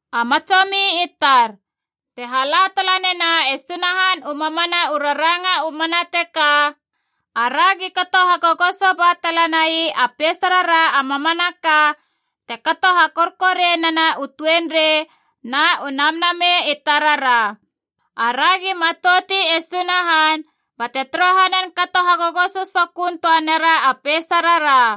A matsomi i tar, te hala tala nena e Sunahan u mamana u raranga u mana teka, aragi kato hagogoso ba tala nai a peisarara a mamanaka te kato hakorkorianena u tuenrei na u namnamei i tarara. Aragi matouti e Sunahan bate torohanan kato hagogoso sokön töa nera a peisarara.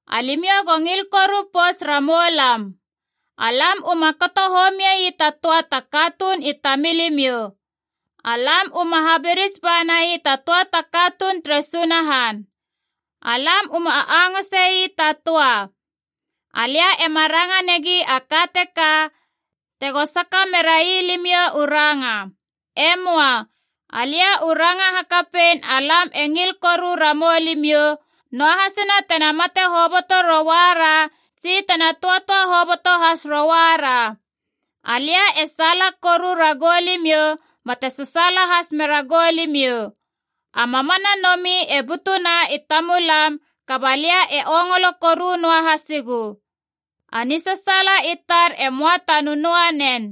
Alimiou go ngil koru pouts ramou lam. Alam uma kato homie ii ta töa ta katuun i tamilimiou. Alam uma habirits ba nai ta töa ta katuun, tere Sunahan. Alam uma angöngose ii ta töa. Alia ema ranga negi a ka teka tego saka merai limiou u ranga. E möa. Alia u ranga hakapein alam e ngil koru ramou limiou, noahasina tena mate hoboto rouara tsi tena töatöa hoboto has rouara. Alia e saala koru ragou limiou bate sasaala has meragou limiou. A mamana nomi e butuna i tamulam, kaba lia e ongolo koru noa hasigu. A nisasaala i tar e möa ta nönöa nen.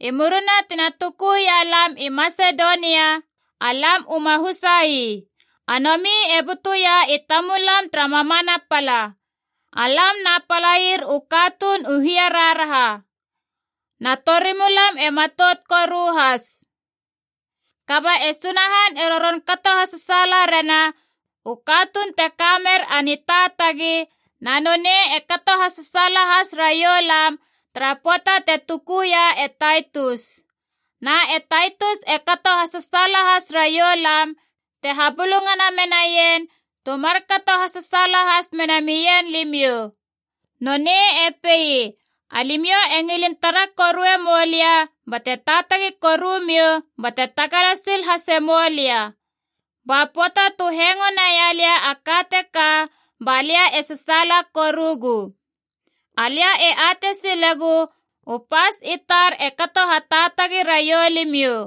I murina tina tukuia lam i Masedonia, alam uma husa ii. A nomi e butuia i tamulam tara mamana pala. Alam na palair u katuun u hiaraharaha, na torimulam e matout koru has. Kaba e Sunahan e roron kato hasasaala rena u katuun te kamer a nitaatagi, na nonei e kato hasasaala has raiou lam tara pöata te tukuia e Taitus. Na e Taitus e kato hasasaala has raiou lam te habulungana menaien tu markato hasasaala has mena mien limiou. Nonei e pei alimiou i ngilin tara korue moulia bate taatagi korumiou bate tagala sil hase moulia. Ba pöata tu hengo naia lia a ka teka ba lia e sasaala korugu. Alia e atei silegu u pas i tar e kato hataatagi raiou limiou.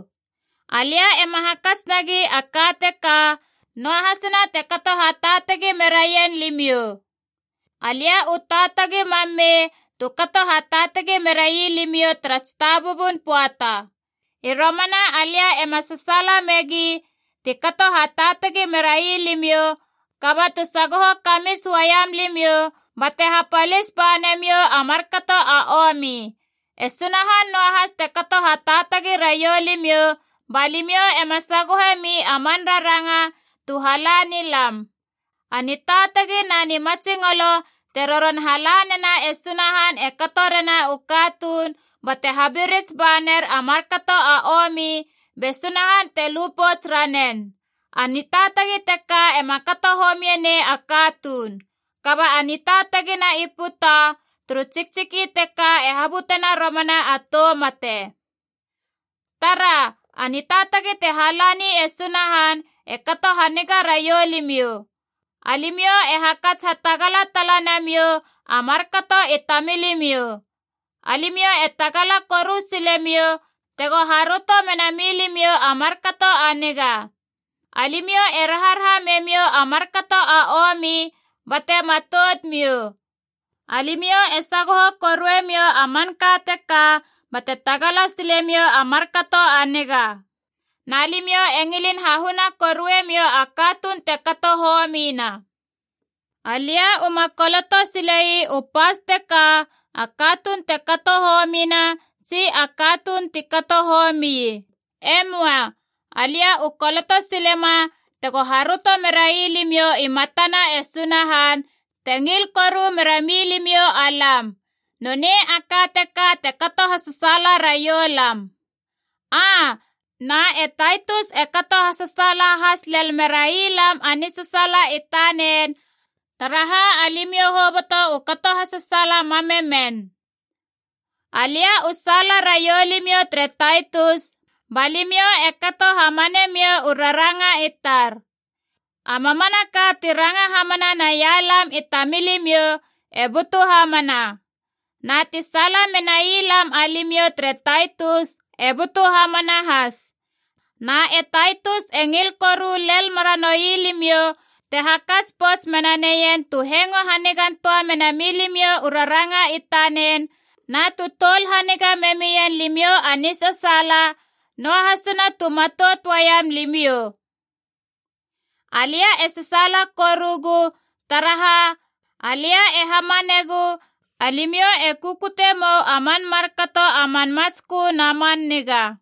Alia ema hakats nagi a ka teka, noahasina te kato hataatagi meraien limiou. Alia u taatagi mam mei tu kato hataatagi merai limiou tara tsitabubun pöata. I romana alia ema sasaala megi ti kato hataatagi merai limiou, kaba tu sagoho kamits uaiam limiou bate hapalis ba namiou a markato a omi. E Sunahan noahas te kato hataatagi raiou limiou ba limiou ema sagohe mi a man raranga tu hala ni lam. A nitaatagi na nimatsingolo te roron halanena e Sunahan e kato rena u katuun bate habirits ba ner a markato a omi be Sunahan te lu pouts ranen. A nitaatagi teka ema kato homie nei a katuun. Kaba a nitaatagi na i puta turu tsiktsiki teka e habutena romana a tou mate. Tara, a nitaatagi te halani e Sunahan e kato haniga raiou limiou: alimiou e hakats hatagala tala namiou a markato i tamilimiou. Alimiou e tagala koru silemiou tego haröto mena milimiou a markato a niga. Alimiou e raharaha memiou a markato a omi bate matoutmiou. Alimiou e sagoho koruemiou a manka teka bate tagala silemiou a markato a niga. Na limiou e ngilin hahuna koruemiou a katuun te kato homina. Alia u ma koloto sile ii u pas teka a katuun te kato homina, tsi a katuun ti kato homii. E möa. Alia u koloto silema tego haröto merai limiou i matana e Sunahan, te ngil koru mera milimiou alam. Nonei a ka teka te kato hasasaala raiou lam. Aa, na e Taitus e kato hasasaala has lel merai lam a nisasaala i tanen, taraha alimiou hoboto u kato hasasaala mam me men. Alia u saala raiou limiou tere Taitus ba limiou e kato hamanemiou u raranga i tar. A mamanaka ti ranga hamana naia lam i tamilimiou e butu hamana. Na ti saala menai lam alimiou tere Taitus e butu hamana has. Na e Taitus e ngil koru lel meranoui limiou te hakats pouts mena neien tu hengo hanigan töa mena milimiou u raranga i tanen na tu toul haniga me mien limiou a nisasaala, noahasina tu matout uaiam limiou. Alia e sasaala korugu, taraha, alia e hamanegu alimiou e kukute mou a man markato a man matskö na man niga.